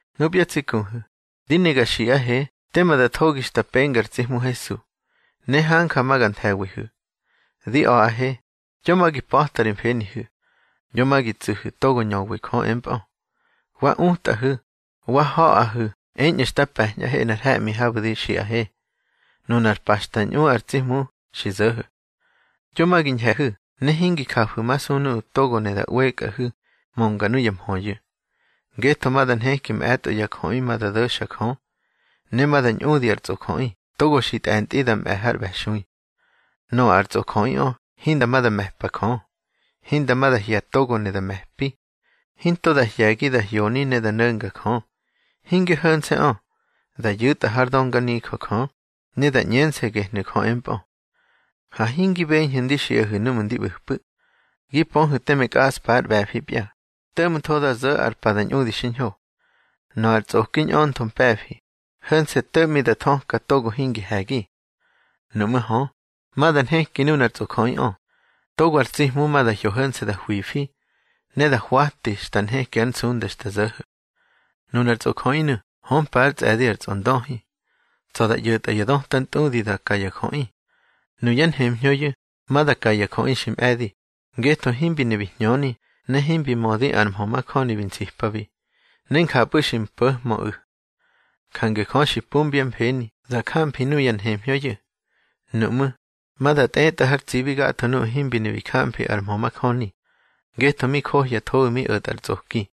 Nupya tsi kuhu̱, di ne ga xiꞌahe tema da thogi xta penga ar tsi Hmu Hesu, ne hanja ma ga nthe̱wihu̱. Di a̱ꞌahe, yo ma gi pa̱ta ri mfenihu̱, yo ma gi tsuhu̱ togo ñöwi Jö empꞌö, wa utꞌahu̱, wa ha̱ꞌahu̱ eñꞌu̱ xta pe̱ñꞌahe nꞌar he̱ꞌmi habu̱ di xiꞌahe, nunar pa xta ñꞌu ar tsi Hmu xi zo̱ho̱. Yo ma gi ñhe̱hu̱ ne hingi jafu̱masu nuꞌu̱ togo ne da ꞌwekꞌahu̱ mönga nuya mhöyu̱. Ngetho ma da nheki mꞌe̱tꞌo ya jöꞌi ma da do̱xa Jö, ne ma da ñꞌudi ar tsꞌojöꞌi togo xi tꞌe̱ntꞌi da mꞌe̱ har ꞌbe̱xui. Nöꞌö ar tsojoꞌiꞌö hinda ma da me̱pa Jö, hinda ma da hye̱ togo ne da me̱pi, hinto da hye̱gi da hyoni ne da no̱nga Jö. Hinge ho̱nse̱ꞌö, da yu̱tꞌa hár dönganijö Jö, ne da ꞌñense̱ gehnu̱ Jö empꞌö. Ha hingi beñhu̱ ndi xiꞌahu̱ núꞌmu̱ ndi ꞌbu̱pꞌu̱. Gi pöhu̱ teme kꞌaꞌspa ár ꞌbe̱fipya, to̱ꞌmtho da zo̱ ar pa da ñꞌudi xiñho. Nöꞌö ar tsꞌoki ñꞌöntho mpe̱fi, ho̱nse̱ to̱ꞌmi da thöka togo hingi he̱gi. Nuꞌmú̱ hö, ma da nheki nunar tsꞌojöꞌiꞌö, togo ar tsi Hmu ma da hyo ho̱nse̱ da hwifi, ne da hwati xta nheki ár nsunda xta zo̱ho̱. Nunar tsꞌojöꞌinu̱ hömpa ár tsꞌe̱di ar Tsꞌondöhi. Tsa̱ da ꞌyo̱tꞌa ya döta ntꞌudi da ka ya jöꞌi. Nuyá nhemhñöyu̱ ma da ka ya jöꞌi xi mꞌe̱di, ngetho himbi ne bi hñöni ne himbi mödi ar mhö majöni bi nsipabi, ne njapꞌu̱ xi mpo̱hmöꞌu̱. Jange Jö xi pumbyá mfeni da jamfi nuya nhemhñöyu̱. Nuꞌmú̱, ma da tꞌetꞌa har tsibi gatho nuꞌu̱ himbi ne bi jamfi ar mhö majöni, ngetho mi johyathoꞌu̱ mi o̱tꞌa ar tsꞌoki.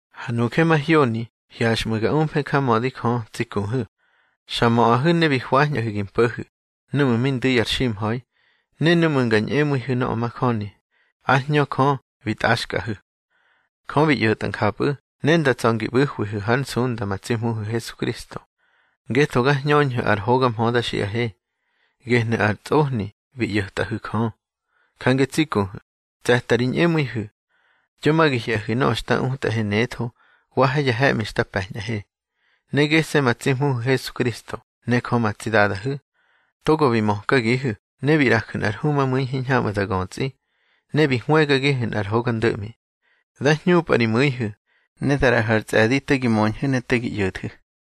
Ha nuje mahyoni hyaxꞌmu̱ ga umfe njamödi Jö tsi kuhu̱, xa möꞌahu̱ ne bi hwañꞌahu̱ ngi mpo̱hu̱, núꞌmu̱ mi ndu̱ ar ximha̱i. Ne núꞌmu̱ nga ñꞌemu̱ihu̱ nöꞌö majöni, ár Hñö Jö bi tꞌaxkꞌahu̱. Jö bi ꞌyo̱tꞌa njapꞌu̱ ne nda tsa̱ ngi ꞌbu̱hwihu̱ hár nsunda ma tsi Hmuhu̱ Hesukristo, ngetho ga hñöñhu̱ ar hoga mhö da xiꞌahe, gehnu̱ ar ntsꞌohni bi ꞌyo̱tꞌaꞌihu̱ Jö. Jange tsi kuhu̱, tse̱ta ri ñꞌemu̱ihu̱. Yo ma gi hye̱hu̱ nöꞌö xta utꞌahe netho, wa ha ya he̱ꞌmi xta pe̱ñꞌahe. Ne gese̱ ma tsi Hmuhu̱ Hesukristo ne Jö ma tsi Dadahu̱, togo bi mökagihu̱ ne bi ꞌraju̱ nꞌar humamu̱i hiñhamꞌu̱ da götsꞌi, ne bi hwëgagihu̱ nꞌar hoga ndo̱ꞌmi, dá hñupꞌa ri mu̱ihu̱, ne da ꞌraꞌahu̱ ar tsꞌe̱di te gi möñhu̱ ne te gi ꞌyo̱thu̱.